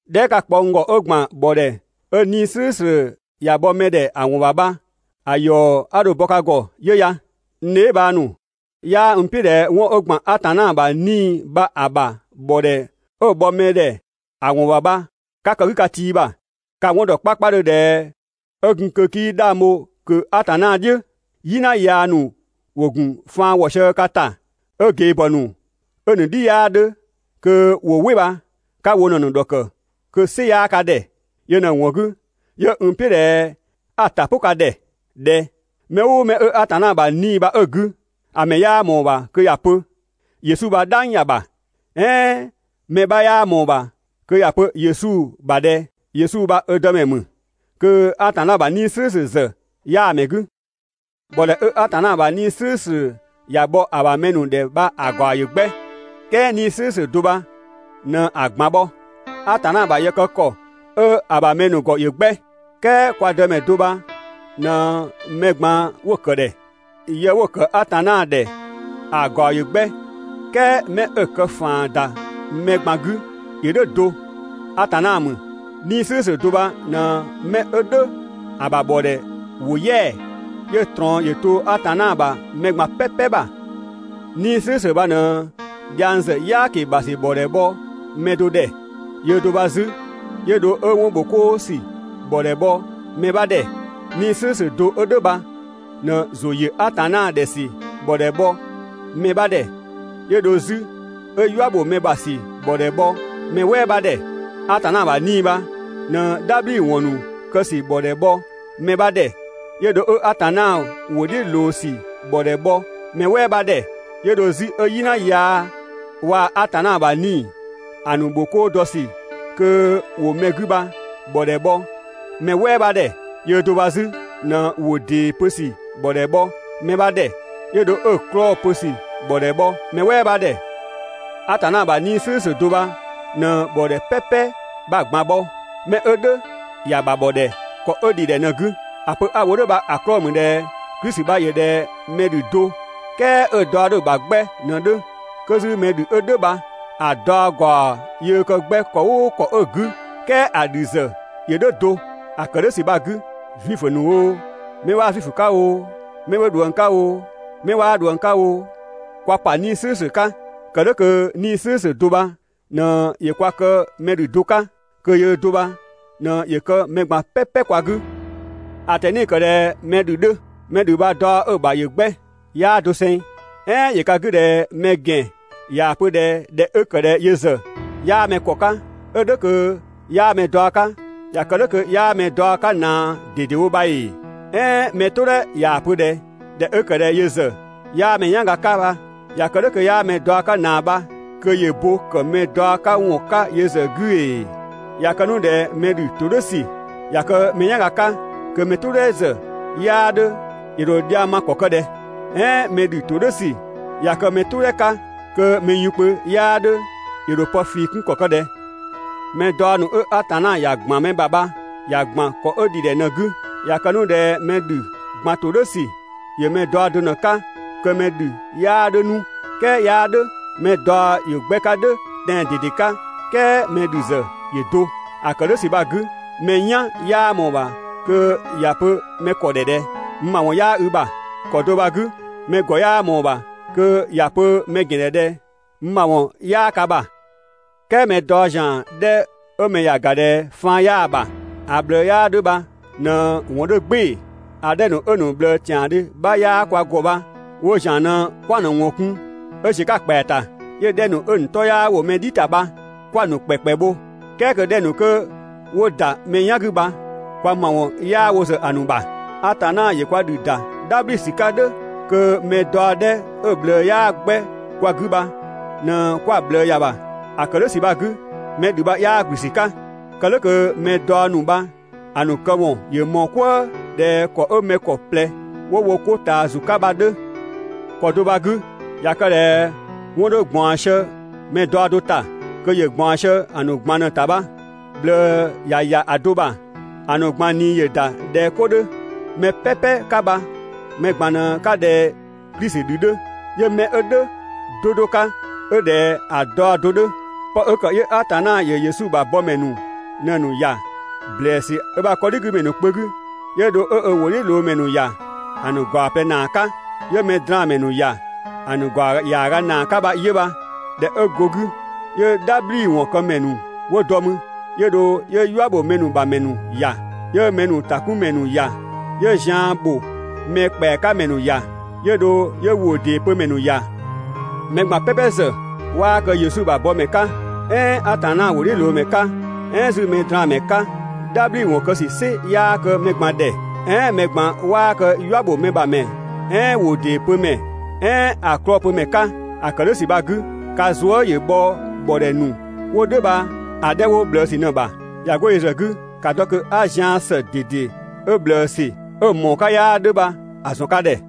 Dhɛɛ" 'ka‑ kpɔ n ‑gɔ 'ö ‑gban ‑bhɔdhɛ 'ö 'Nii‑ "slʋ̈ʋ̈slʋ̈ ‑ya bhɔ mɛdhɛ ‑a ‑wɔn ‑bha bha‑ ‑yɔ 'a dho‑ bɔ ka ‑gɔ 'yö ya. N dheebhang ‑nu, 'yaa n "piʋ̈ ꞊dhɛ 'wɔn 'ö ‑gban Atanna ‑bha 'Nii‑ bha‑ ‑bha ‑bhɔdhɛ 'ö‑ bhɔ mɛdhɛ ‑a ‑wɔn ‑bha bha 'ka kë‑ 'gü ka tii ‑bha. Ka‑ 'wɔn ‑dɔ 'kpakpadhö ꞊dhɛ 'ö gun kö 'kii 'dhang bho ꞊kö Atanna "dhiʋ̈, "yina yaa ‑nu ‑wo ‑gun faan wɔ sië ka ‑ta 'ö ꞊gebhɔ ‑nu 'ö‑ ‑nu "dhi 'yaa 'dhö kö ‑wo "wɩ bha 'ka wo ꞊në‑ ‑dhɔkë kö‑ "sɩ 'yaa ka ‑dhɛ. Yö ꞊në‑ ‑wɔn 'gü 'yö n "piʋ̈ ꞊dhɛ 'a‑ ‑ta "pʋ ka ‑dhɛ ꞊dhɛ: mɛ "ʋʋ mɛ 'ö Atanna ‑bha 'Nii‑ bha 'ö‑ 'gü, ‑a ‑mɛ 'yaa ꞊mɔɔ‑ ‑bha kö ‑ya pö: «Yesu bha "dhang ‑ya ‑bha», "ɛɛn mɛ 'bha 'yaa ꞊mɔɔ‑ ‑bha kö ‑ya pö Yesu ‑bha ꞊dhɛ: «Yesu bha ö Dëmɛ ‑mü» kö Atanna ‑bha 'Nii‑ "slʋ̈ʋ̈slʋ̈ ‑zë 'yaa‑ ‑mɛ 'gü. ‑Bhɔdhɛ 'ö Atanna ‑bha 'Nii‑ "slʋ̈ʋ̈slʋ̈ ‑ya bhɔ‑ ‑bha mɛ ‑nu ‑dhɛ bha‑ ‑gaɔ ‑yö 'gbɛ, "kɛɛ 'Nii‑ "slʋ̈ʋ̈slʋ̈ do bha ꞊në‑ ꞊gban bhɔ. Atanna ‑bha yë kë ‑kɔ 'ö‑ ‑bha mɛ ‑nu ‑gɔ ‑yö 'gbɛ, "kɛɛ kwa Dëmɛ do bha ꞊në mɛ ꞊gban 'wo‑ ‑kë ‑dhɛ. Yë 'wo‑ ‑kë Atanna ‑dhɛ ‑a ‑gaɔ ‑yö 'gbɛ "kɛɛ 'mɛ 'ö‑ kë ‑faan ‑da mɛ ꞊gban 'gü ‑yö "dhʋ̈ do, Atanna ‑mü. 'Nii‑ "slʋ̈ʋ̈slʋ̈ do bha ꞊në 'mɛ 'ö "dhʋ̈ ‑a ‑bha ‑bhɔdhɛ ‑wo "yɛa‑, 'yö‑ ꞊trɔɔn ‑yö to Atanna ‑bha mɛ ꞊gban "pɛpɛ ‑bha. 'Nii‑ "slʋ̈ʋ̈slʋ̈ bha ꞊në dhiang ‑zë "yaaki bha ‑sü ‑bhɔdhɛ bhɔ mɛ do ‑dhɛ, yöö do bha 'zü 'yö dho 'ö 'wɔnbhokoo ‑sü ‑bhɔdhɛ bhɔ mɛ 'bha ‑dhɛ. 'Nii‑ "slʋ̈ʋ̈slʋ̈ do 'ö "dhʋ̈ bha ꞊në ‑zʋ ‑yö Atanna ‑dhɛ ‑sü ‑bhɔdhɛ bhɔ mɛ 'bha ‑dhɛ, 'yö dho 'zü 'ö "yua ‑bho mɛ ‑bha ‑sü ‑bhɔdhɛ bhɔ mɛ "wɛɛ 'bha ‑dhɛ. Atanna ‑bha 'Nii‑ bha ꞊në "dhabhliwɔn ‑nu kë ‑sü ‑bhɔdhɛ bhɔ mɛ 'bha ‑dhɛ, 'yö dho 'ö Atanna ‑wʋ "dhiʋ̈ ꞊loo ‑sü ‑bhɔdhɛ bhɔ mɛ "wɛɛ 'bha ‑dhɛ, 'yö dho 'zü 'ö "yina yaa waa‑ Atanna ‑bha 'Nii‑ ‑a ‑nu ‑bho 'koo dɔ ‑sü kö ‑wo mɛ 'gü bha‑ ‑bhɔdhɛ bhɔ mɛ "wɛɛ 'bha ‑dhɛ. Yöö do bha 'zü ꞊në ‑wʋ ‑dee pö ‑sü ‑bhɔdhɛ bhɔ mɛ 'bha ‑dhɛ, 'yö dho 'ö‑ 'klɔɔ‑ pö ‑sü ‑bhɔdhɛ bhɔ mɛ "wɛɛ 'bha ‑dhɛ. Atanna ‑bha 'Nii‑ "slʋ̈ʋ̈slʋ̈ do bha ꞊në ‑bhɔdhɛ "pɛpɛ bha‑ ꞊gban bhɔ, 'mɛ 'ö "dhʋ̈ ‑ya ‑bha ‑bhɔ ‑dhɛ ‑kɔ 'ö ‑dhidhɛ ꞊në‑ 'gü. ‑A pö 'a‑ wo "dhʋ̈ bha‑ 'klɔɔ‑ ‑mü ꞊dhɛ Klisi bha ‑yö ꞊dhɛ mɛ ‑dhü do, "kɛɛ 'ö‑ daɔ 'dhö‑ ‑bha 'gbɛ ꞊në‑ 'dhö. 'Kö 'zü mɛ ‑dhü 'ö "dhʋ̈ bha‑ daɔ ‑gaɔ yöö kë 'gbɛ ‑kɔ "ʋʋ ‑kɔ 'ö‑ 'gü, "kɛɛ ‑a ‑dhü ‑zë ‑yö "dhʋ̈ do. ‑A ‑kë "dhʋ̈ ‑sü bha‑ 'gü, Zuifö ‑nu oo, 'mɛ 'waa Zuifö 'ka oo, 'mɛ 'wo ꞊dhuëng 'ka oo, 'mɛ 'waa ꞊dhuëng 'ka oo, kwa ‑pa 'Nii‑ "slʋ̈ʋ̈slʋ̈ 'ka, kë "dhʋ̈ kö 'Nii‑ "slʋ̈ʋ̈slʋ̈ do bha ꞊në ‑yö kwa kë mɛ ‑dhü do 'ka, kö yöö do bha ꞊në ‑yö kë mɛ ꞊gban "pɛpɛ 'kwa 'gü. ‑A ꞊tɛni‑ ‑kë ꞊dhɛ mɛ ‑dhü 'dhö. Mɛ ‑dhü bha‑ daɔ 'ö‑ ‑bha ‑yö 'gbɛ, 'yaa doseng. "Ɛɛn ‑yö ka 'gü ꞊dhɛ mɛ ‑gɛn ꞊yaa‑ pö ꞊dhɛ ꞊dhɛ 'ö ‑kë ꞊dhɛ yö ‑zë 'yaa mɛ ‑kɔ 'ka, 'ö "dhʋ̈ kö 'yaa mɛ daɔ 'ka, ꞊ya kë "dhʋ̈ kö 'yaa mɛ daɔ 'ka ꞊naa ꞊dedewo bha ‑ee? "Ɛɛn mɛ "tʋdhɛ ꞊yaa‑ pö ꞊dhɛ: «꞊Dhɛ 'ö ‑kë ꞊dhɛ yö ‑zë 'yaa mɛ "yanga 'ka bha», ꞊ya kë "dhʋ̈ kö 'yaa mɛ daɔ 'ka ꞊naa bha, kö ‑yö bo ‑kë mɛ daɔ 'ka ‑wɔn 'ka yö ‑zë 'gü ‑ee? ꞊Ya kë 'nu ꞊dhɛ mɛ ‑dhü ‑todhʋ̈sü ꞊ya kë mɛ "yanga 'ka kö mɛ "tʋʋdhɛ ‑zë 'yaa 'dhö, ‑yö ‑dho dhiang ma ‑kɔ ‑kë ꞊dhɛ? "Ɛɛn mɛ ‑dhü ‑todhʋ̈sü ꞊ya kë mɛ "tʋdhɛ 'ka kö mɛ yunkpö 'yaa 'dhö ‑yö ‑dho pë ꞊fii 'kun ‑kɔ ‑kë ꞊dhɛ? Mɛ daɔ ‑nu 'ö Atanna ‑ya ‑gban mɛ ‑bha bha ‑ya ‑gban ‑kɔ 'ö ‑dhidhɛ ꞊në‑ 'gü. ꞊Ya kë 'nu ꞊dhɛ mɛ ‑dhü ꞊gban ‑todhʋ̈sü ‑yö mɛ daɔ do ꞊në‑ 'ka, kö 'mɛ ‑dhü 'yaa 'dhö 'nu! "Kɛɛ 'yaa "dhʋ̈. Mɛ daɔ ‑yö 'gbɛ 'ka "dhʋ̈ tɛan‑ ꞊dede 'ka "kɛɛ mɛ ‑dhü ‑zë ‑yö do. ‑A ‑kë "dhʋ̈ ‑sü bha‑ 'gü, mɛ "yan 'yaa ꞊mɔɔ‑ ‑bha kö ‑ya pö mɛ ‑kɔ ‑dhɛ ꞊dhɛ: «N ‑mawɔn 'yaa i ‑bha!» ‑Kɔ do bha‑ 'gü, mɛ ‑gɔ 'yaa ꞊mɔɔ‑ ‑bha 'pö kö ‑ya pö mɛ ‑gɛn ‑dhɛ: «N ‑mawɔn 'yaa ka ‑bha!» "Kɛɛ mɛ 'daɔ ‑zian 'dhɛ 'ö mɛ ‑ya ‑ga ꞊dhɛ faan 'yaa‑ ‑bha, ‑a ꞊bhlëë 'yaa 'dhö bha ꞊në‑ ‑wɔn 'dhö "gbɩɩ‑. ‑A 'dhɛ ‑nu 'ö‑ ‑nu ꞊bhlëë ‑tiandhö 'bha 'yaa kwa ‑gɔ bha woo ‑zian ꞊në 'kwa‑ ‑nu ‑wɔn kun 'ö ‑ziö 'ka‑ ‑kpɛa ‑ta. 'Yö‑ 'dhɛ ‑nu 'ö‑ ‑nu 'tɔ 'yaa ‑wo mɛ "dhi ‑ta bha 'kwa‑ ‑nu ‑kpɛkpɛ bho, "kɛɛ kö‑ 'dhɛ ‑nu 'kö 'wo ‑da mɛ "yan 'gü bha kwa ‑mawɔn 'yaa wo ‑zë ‑a ‑nu ‑bha. Atanna ‑yö kwa ‑dhü ‑da "dhabhli ‑sü 'ka "dhʋ̈ kö mɛ daɔ 'dhɛ 'ö‑ ꞊bhlëë 'yaa 'gbɛ kwa 'gü bha ꞊në 'kwa ꞊bhlëë ‑ya ‑bha. ‑A ‑kë "dhʋ̈ ‑sü bha‑ 'gü, mɛ ‑dhü bha 'yaa ‑gblü ‑sü 'ka, kë "dhʋ̈ kö mɛ daɔ ‑nu bha‑ ‑nu këwɔn ‑yö ꞊mɔɔ "kwëë, ꞊dhɛ ‑kɔ 'ö mɛ ‑kɔ ꞊plɛ ‑wo wo 'ko ꞊taa ‑zu 'ka bha‑ 'dhö. ‑Kɔ do bha‑ 'gü, ꞊ya kë ꞊dhɛ 'wɔn 'dhö ꞊gbaɔn sië mɛ daɔ do ‑ta, kö ‑yö ꞊gbaɔn sië‑ ‑nu ꞊gban ꞊në‑ ‑ta bha, ꞊bhlëë ꞊ya ‑ya a do ‑bha, ‑a ‑nu ꞊gban ꞊nii ‑yö ‑da ꞊dhɛ 'ko 'dhö. Mɛ "pɛpɛ 'ka bha mɛ ꞊gban ꞊në 'ka ꞊dhɛ Klisi ‑dhü 'dhö, 'yö mɛ 'ö "dhʋ̈ 'do 'do 'ka 'ö ꞊dhɛ ‑a daɔ do 'dhö. 'Pë 'ö ‑kë 'yö Atanna ‑yö Yesu ‑bha bɔmɛ ‑nu ꞊në‑ ‑nu ‑ya ‑blɛɛsü 'ö ‑bha 'kɔdhigümɛ ‑nu kpö 'gü, 'yö dho 'ö ö ‑wʋdhiʋ̈loomɛ ‑nu ‑ya ‑a ‑nu ‑gaɔ ꞊plɛ ‑naa 'ka, 'yö mɛdraanmɛ ‑nu ‑ya ‑a ‑nu ‑gaɔ ‑yaaga ‑naa 'ka bha 'yö bha. ꞊Dhɛ 'ö go‑ 'gü, 'yö "dhabhliwɔn këmɛ ‑nu 'wo dɔ mü, 'yö dho 'yö "yua ‑bho mɛ ‑bha ‑mɛ ‑nu ‑ya, 'yö mɛ ‑nu ‑takunmɛ ‑nu ‑ya, 'yö zian ‑bho mɛ ‑kpɛa 'ka ‑mɛ ‑nu ‑ya, 'yö dho 'yö ‑wʋ ‑dee pö ‑mɛ ‑nu ‑ya. Mɛ ꞊gban "pɛpɛ ‑zë 'waa kë Yesu ‑bha bɔmɛ 'ka, "ɛɛn Atanna ‑wʋdhiʋ̈loomɛ 'ka, "ɛɛn 'zü mɛdraanmɛ 'ka. "Dhabhliwɔn kë "sɩ 'yaa kë mɛ ꞊gban ‑dhɛ. "Ɛɛn mɛ ꞊gban 'waa kë "yua ‑bho mɛ ‑bha ‑mɛ "ɛɛn ‑wʋ ‑dee pö ‑mɛ, "ɛɛn ‑a 'klɔɔ‑ pö ‑mɛ 'ka. ‑A ‑kë "dhʋ̈ ‑sü bha‑ 'gü, ka zuë" ‑yö bhɔ ‑bhɔdhɛ ‑nu 'wo "dhʋ̈ bha‑ 'dhɛ ‑nu 'wo ꞊bhlëësü ꞊në‑ ‑bha. ꞊Ya go yö ‑zë 'gü, ‑ka dɔ kö 'a zian ‑së ꞊dede 'ö ꞊bhlëësü, 'ö‑ ‑mɔɔ 'ka 'yaa 'dhö bha‑ ‑zɔn ka ‑dhɛ.